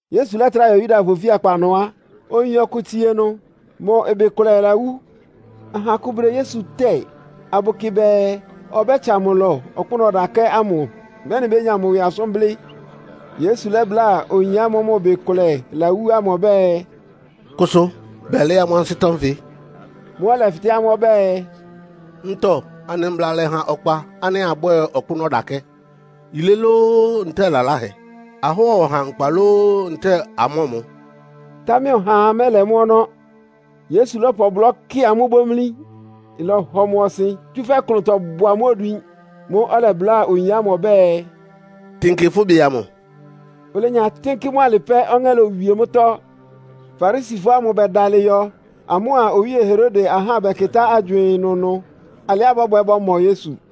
Yesu lɛ́trá yɔ Yudafɔ ofíakpa ɩnʋ á, oyin ɔkʋ tsie ɩnʋ, mʋ ɩbɩ kʋlɛ lawú. Aha akʋ bʋdɛ Yesu tɛ́ɛ, abʋkɩ bɛɛ ɔbɛ́tsa mʋ ɩlɔ ɔkpʋ́nʋ́ ɔdakɛ́ ámʋ, mɛ́nɩ bénya mʋ ɩwɩ asʋ́n blɩ́. Yesu lɛ́bláa oyin ámʋ́ʋ́ mʋ ɩbɩ kʋlɛ lawú ámʋ ɔbɛ́ɛ, “Kʋsʋ bɛlɩɩ́ amʋ́ ansɩ́tɔ́ nfɩ.” Mʋ́ʋ́ ɔlɛfɩtɛ́ amʋ́ ɔbɛ́ɛ, “Ntɔ anɩ mbla lɛ́ha ɔkpa ánɩ́ abwɛ́ɛ ɔkpʋ́nʋ́ ɔdakɛ́? Yilé lóó, ntɛ́ɛ lalahɛ. Ahɔ́ɔ ɔha nkpa lóó, ntɛ́ɛ amɔ́ɔ mʋ?” Támɛ ɔhaa mɛ́lɛ mʋ́ ɔnɔ́. Yesu lɔ́pʋ ɔblɔ́ kɩ amʋ́ bómlí. Ɩlɔhɔ mʋ ɔsɩn, tsúfɛ́ klʋntɔ bʋ amʋ́ odwin. Mʋ́ʋ́ ɔlɛbláa oyin ámʋ ɔbɛ́ɛ, “Tɩnkɩ fʋ́ ɩbɩ amʋ.” Olenya tɩ́nkɩ́ mʋ́ alɩ pɛ́, ɔŋɛ́ lowie mʋ́tɔ́. Farisifɔ ámʋ bɛdalɩ yɔ, amʋ́a Owíe Herode ahá bɛkɩtá agywɩɩn ɩnʋnʋ alɩá bɔ́bwɛ bɔ́mɔ Yesu.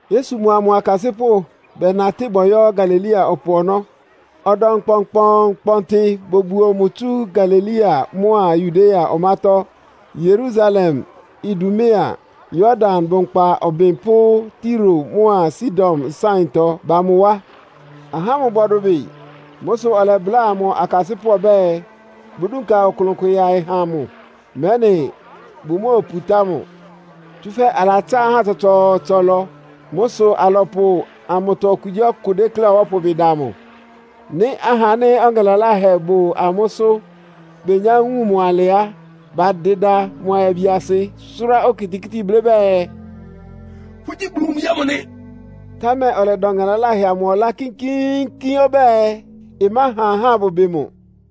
Yesu mʋa mʋ akasɩ́pʋ́ bɛnatɩ́ bɔyɔ́ Galilea ɔpʋ ɔnɔ́. Ɔdɔm kpɔnkpɔɔnkpɔntɩ bobuo mʋ tsú Galilea mʋ́a Yudea ɔmátɔ́, Yerusalem, Idumea, Yordan bʋnkpa ɔbɩn pʋ́ Tiro mʋ́a Sidon nsáɩntɔ ba mʋ wá. Ahá ámʋ bɔdʋbɩ. Mʋ́ sʋ ɔlɛbláa mʋ akasɩ́pʋ́ ɔbɛ́ɛ, bʋdúnka ɔklʋn kʋ yaɩ ha mʋ, mɛ́nɩ bʋmóoputá mʋ. Tsúfɛ́ alatsá ahá tsɔtsɔɔtsɔ ɩlɔ. Mʋ́ sʋ alɔpʋ amʋtɔ okugyíɔkʋ dékléá ɔbɔ́pʋ ɩbɩ da mʋ. Nɩ́ ahá ánɩ́ ɔŋɛ laláhɛ bʋ amʋ́sʋ́ benyá wun mʋ alɩ á, badɩda mʋ ayabiasɩ, sʋ́rá okitikíti blɩ́ bɛɛ, “Fʋ́gyí Bulu mʋ Bi ámʋ nɩ!” Támɛ ɔlɛda ɔŋɛ laláhɛ amʋ ɔlá kínkíínkín ɔbɛ́ɛ, ɩmáha ahá abʋbɩ mʋ.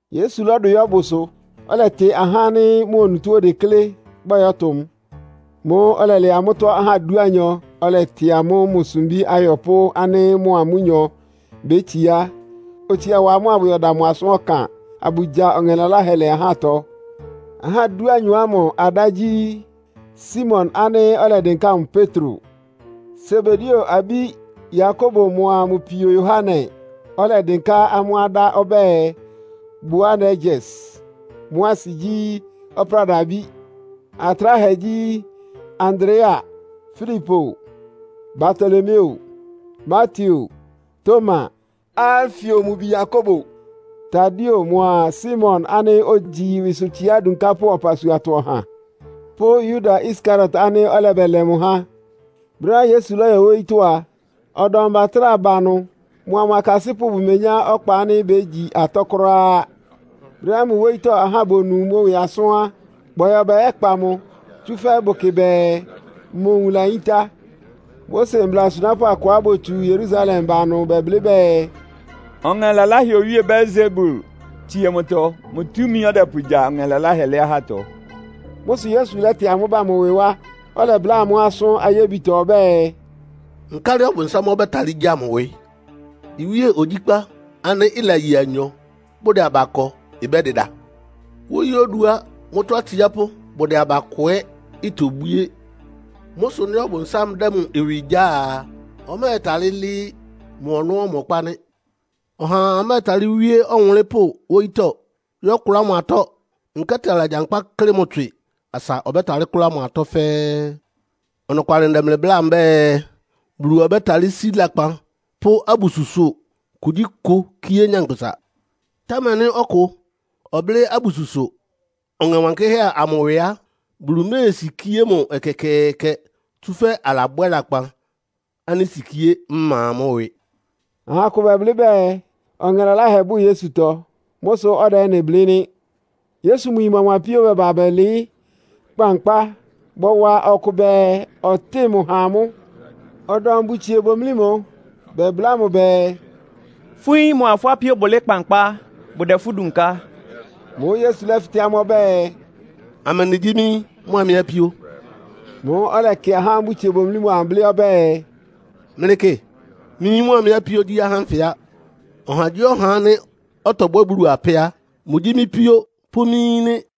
Yesu lɔ́dʋ yɔ́ bʋsʋ, ɔlɛtɩ ahá ánɩ́ mʋ onutó odeklé, bɔyɔ́tʋ mʋ. Mʋ́ʋ́ ɔlɛlɛ amʋ́tɔ́ ahá dúanyɔ, ɔlɛtɩ amʋ́ mʋ sumbí ayɔpʋ́ ánɩ́ mʋa amʋ́nyɔ bétsiá, otsia wa amʋ́ abʋyɛda mʋ asʋ́n ɔkan, abʋgya ɔŋɛ laláhɛ lɛ́ ahátɔ. Ahá dúanyɔ ámʋ adá gyí, Simon ánɩ́ ɔlɛdɩnká mʋ Petro; Sebedeo abí Yakobo mʋa mʋ pio Yohane (ɔlɛdɩnká amʋ́ adá ɔbɛ́ɛ, “Boanerges.” Mʋ́ asɩ gyí, “Ɔpráda abí.”); Atráhɛ gyí, Andrea, Filipo, Bartolomeo, Mateo, Toma, Alfeo mʋ bi Yakobo, Tadeo mʋa Simon ánɩ́ ogyi ɩwɩsʋtsiá adunkápʋ́ ɔpasuatɔ ɔha; pʋ́ Yuda Iskariot ánɩ́ ɔlɛbɛlɛ mʋ há. Brɛ́á Yesu lɔ́yɔ wóyítɔ́ a, ɔdɔm bɛtrá ba ɩnʋ. Mʋa mʋ akasɩ́pʋ́ bʋmenyá ɔkpa ánɩ́ bégyi atɔ́ kʋ́ráá. Brɛ́á mʋ wóyítɔ́ ahá bonu mʋ ɩwɩ asʋ́n á, bɔyɔ bɛyɛ́kpa mʋ, tsúfɛ́ bʋkɩ bɛɛ mʋ nwun layíntá. Mose mbla asunápʋ́ akʋá botsu Yerusalem ba ɩnʋ bɛblɩ́ bɛɛ, “Ɔŋɛ laláhɛ owíe Beelsebul tsíe mʋtɔ. Mʋ túmi ɔdɛpʋgya ɔŋɛ laláhɛ lɛ́ ahátɔ.” Mʋ́ sʋ Yesu lɛ́tɩ amʋ́ ba mʋ ɩwɩ wá, ɔlɛbláa amʋ́ asʋ́n ayébitɔ ɔbɛ́ɛ, “Nkálɩ Ɔbʋnsám ɔbɛ́talɩ́ gya mʋ ɩwɩ? Iwíe ogyíkpá ánɩ́ ɩlaye anyɔ, bʋdɛ aba kɔ ɩbɛ́dɩda. Wóyí oduá mʋ́tɔ́ atsiápʋ́ bʋdɛ aba kɔ ɛ́ itobwíé. Mʋ́ sʋ nɩ́ Ɔbʋnsám dɛ́ mʋ ɩwɩ gyáa a, ɔmɛ́ɛtalɩ́ lɩ́ɩ́. Mʋ ɔnɔ́ ɔmɔkpá nɩ́. “Ɔhaa mɛ́ɛtalɩ́ wíé ɔwʋnlɩ́npʋ́ wóyítɔ́ yɔ́kʋlá mʋ atɔ́, nkɛ́tɩ alagyankpá kɩ́klɩ mʋ tswɩ, asa ɔbɛ́talɩ́ kʋ́lá mʋ atɔ́ fɛ́ɛ́. “Ɔnɔkwalɩ ndɛ mlɩ bláa mbɛ́ɛ, Bulu ɔbɛ́talɩ́ sí lakpan pʋ́ abususʋ kugyíkʋ kíé nyankpʋsa. Támɛ nɩ́ ɔkʋ ɔblɩ́ abususʋ Ɔŋɛ Wankɩ́hɛ́ amʋ ɩwɩ á, Bulu méesikíé mʋ ɛkɛkɛɛkɛ, tsúfɛ́ alabwɛ́ lakpan ánɩ́ sikíé ma mʋ́ ɩwɩ.” Aha akʋ bɛblɩ́ bɛɛ, ɔŋɛ laláhɛ bʋ́ Yesutɔ. Mʋ́ sʋ ɔdɛ ɩ́nɩ blɩ́ nɩ́. Yesu mʋ yin mʋa mʋ apio bɛba bɛlɩɩ́ kpankpá, bɔwa ɔkʋ bɛɛ, ɔtɩ́ɩ mʋ ha amʋ́. Ɔdɔm bʋtsie bomlí mʋ, bɛbláa mʋ bɛɛ, “Fʋ́ yín mʋa fʋ́ apíó bʋlɩɩ́ kpankpá, bʋdɛ fʋ́ dunká.” Mʋ́ʋ́ Yesu lɛ́fɩtɛ́ amʋ́ ɔbɛ́ɛ, “Amɛndɩ gyí mɩ́ yín mʋa mɩ́ apíó?” Mʋ́ʋ́ ɔlɛkɩ ahá ámʋ́ʋ́ bʋtsie bomlí mʋ amʋ, blɩ́ ɔbɛ́ɛ, “Mlɩkɩ, mɩ́ yín mʋa mɩ́ apíó gyí ahá ánfɩ á! Ɔhagyíɔha ánɩ́ ɔtɔbwɛ́ Bulu apɛ́ a, mʋgyí mɩ́ píó pʋ́ mɩ́ yín nɩ́.”